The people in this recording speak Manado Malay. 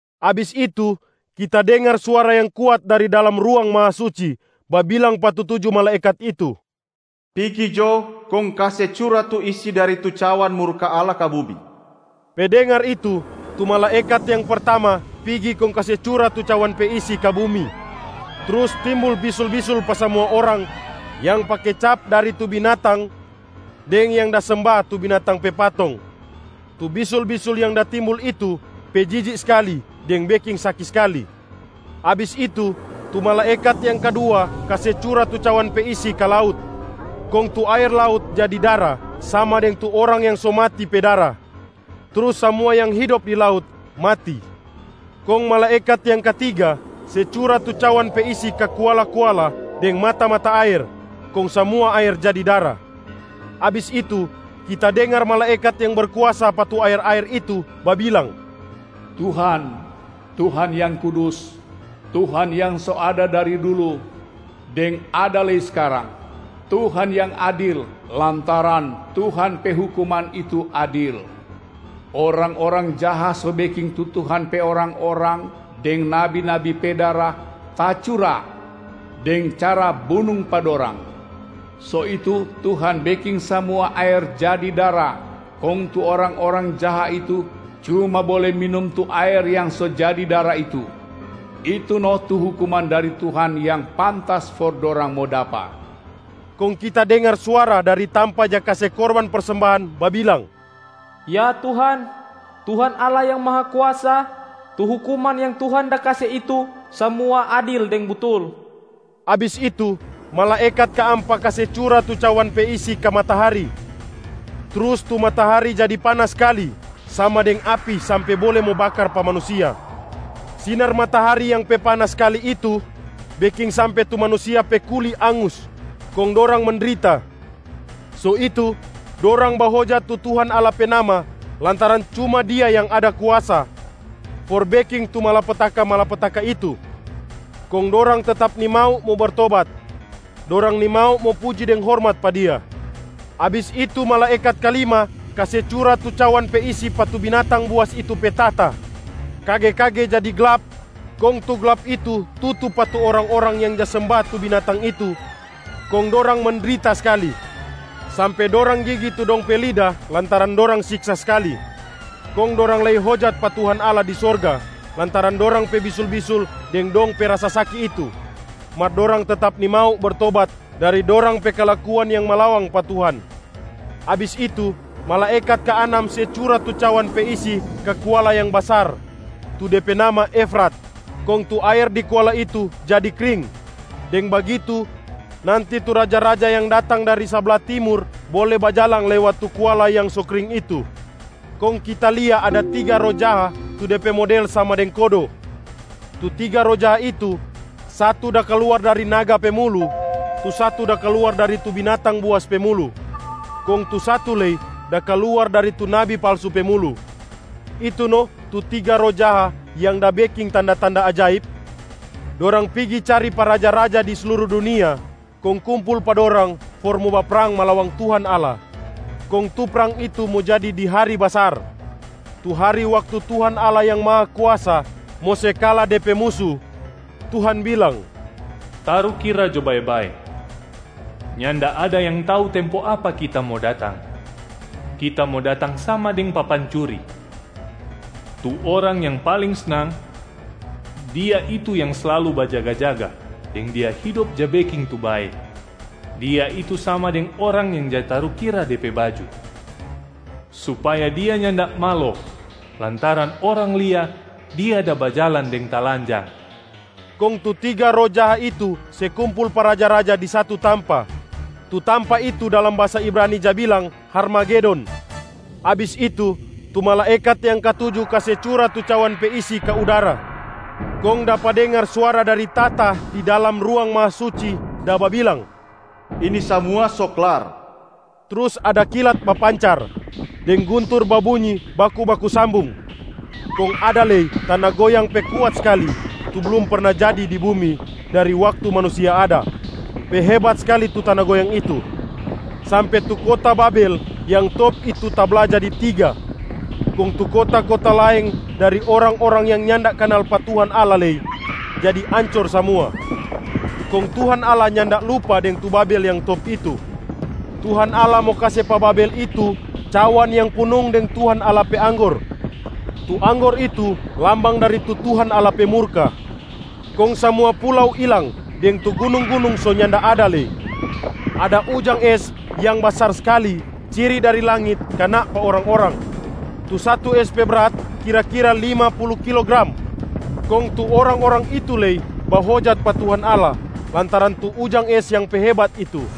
Abis itu, kita dengar suara yang kuat dari dalam Ruang Mahasuci babilang pa tu tuju malaekat itu, “Pigi jo kong kase cura tu isi dari tuju cawan murka Allah ka bumi!” Pe dengar itu, tu malaekat yang pertama pigi kong kase cura tu cawan pe isi ka bumi, trus timbul bisul-bisul pa samua orang yang pake cap dari tu binatang deng yang da semba tu binatang pe patong. Tu bisul-bisul yang da timbul itu pe jijik skali deng beking saki skali. Abis itu, tu malaekat yang kadua kase cura tu cawan pe isi ka laut, kong tu aer laut jadi dara sama deng tu orang yang so mati pe dara, trus samua yang hidop di laut mati. Kong malaekat yang katiga se cura tu cawan pe isi ka kuala-kuala deng mata-mata aer, kong samua aer jadi dara. Abis itu kita dengar malaekat yang berkuasa pa tu aer-aer itu babilang, “Tuhan, Tuhan Yang Kudus. Tuhan yang so ada dari dulu, deng ada lei skarang. Tuhan Yang Adil lantaran Tuhan pe hukuman itu adil. Orang-orang jaha so beking tu Tuhan pe orang-orang deng nabi-nabi pe dara tacura deng cara bunung pa dorang, so itu Tuhan beking samua aer jadi dara kong tu orang-orang jaha itu cuma bole minum tu aer yang so jadi dara itu. Itu no tu hukuman dari Tuhan yang pantas for dorang mo dapa.” Kong kita dengar suara dari tampa ja kase korban persembahan babilang, “Ya Tuhan, Tuhan Allah Yang Mahakuasa. Tu hukuman yang Tuhan da kase itu samua adil deng butul!” Abis itu, malaekat kaampa kase cura tu cawan pe isi ka matahari, trus tu matahari jadi panas skali sama deng api sampe bole mo bakar pa manusia. Sinar matahari yang pe panas skali itu beking sampe tu manusia pe kuli angus kong dorang mendrita. So itu, dorang bahojat tu Tuhan Allah pe nama lantaran cuma Dia yang ada kuasa for beking tu malapetaka-malapetaka itu. Kong dorang tetap nimau mo bertobat, dorang nimau mo puji deng hormat pa Dia. Abis itu malaekat kalima kase cura tu cawan pe isi pa tu binatang buas itu pe tahta. Kage-kage jadi glap kong tu glap itu tutu pa tu orang-orang yang ja semba tu binatang itu kong dorang mendrita skali, sampe dorang gigi tu dong pe lida lantaran dorang siksa skali. Kong dorang lei hojat pa Tuhan Allah di sorga lantaran dorang pe bisul-bisul deng dong pe rasa saki itu, mar dorang tetap nimau bertobat dari dorang pe kalakuan yang malawang pa Tuhan. Abis itu, malaekat kaanam se cura tu cawan pe isi ka kuala yang basar tu de pe nama Efrat, kong tu aer di kuala itu jadi kring. Deng bagitu nanti tu raja-raja yang datang dari sabla timur bole bajalang lewat tu kuala yang so kring itu. Kong kita lia ada tiga roh jaha tu de pe model sama deng kodo. Tu tiga roh jaha itu, satu da kaluar dari naga pe mulu, tu satu da kaluar dari tu binatang buas pe mulu, kong tu satu lei da kaluar dari tu nabi palsu pe mulu. Itu no tu tiga roh jaha yang da beking tanda-tanda ajaib. Dorang pigi cari pa raja-raja di sluru dunia kong kumpul pa dorang for mo baprang malawang Tuhan Allah. Kong tu prang itu mo jadi di hari basar, tu hari waktu Tuhan Allah Yang Mahakuasa mo se kala De pe musu. Tuhan bilang, “Tarukira jo bae-bae, nyanda ada yang tau tempo apa Kita mo datang, Kita mo datang sama deng papancuri. Tu orang yang paling snang, dia itu yang slalu bajaga-jaga deng dia hidop ja beking tu bae, dia itu sama deng orang yang ja tarukira de pe baju, supaya dia nyanda malo lantaran orang lia dia da bajalang deng talanjang.” Kong tu tiga roh jaha itu se kumpul pa raja-raja di satu tampa, tu tampa itu dalam bahasa Ibrani ja bilang Harmagedon. Abis itu, tu malaekat yang katuju kase cura tu cawan pe isi ka udara, kong dapa dengar suara dari tahta di dalam Ruang Mahasuci da babilang, “Ini samua so klar.” Trus ada kilat bapancar, deng guntur babunyi baku-baku sambung. Kong ada lei tana goyang pe kuat skali tu blum perna jadi di bumi dari waktu manusia ada. Pe hebat skali tu tana goyang itu, sampe tu kota Babel yang top itu tabla jadi tiga. Kong tu kota-kota laeng dari orang-orang yang nyanda kanal pa Tuhan Allah lei jadi ancor samua. Kong Tuhan Allah nyanda lupa deng tu Babel yang top itu, Tuhan Allah mo kase pa Babel itu cawan yang punung deng Tuhan Allah pe anggor, tu anggor itu lambang dari tu Tuhan Allah pe murka. Kong samua pulau ilang deng tu gunung-gunung so nyanda ada lei. Ada ujang es yang basar skali ciri dari langit kana pa orang-orang, tu satu es pe brat kira-kira lima pulu kilogram. Kong tu orang-orang itu lei bahojat pa Tuhan Allah lantaran tu ujang es yang pe hebat itu.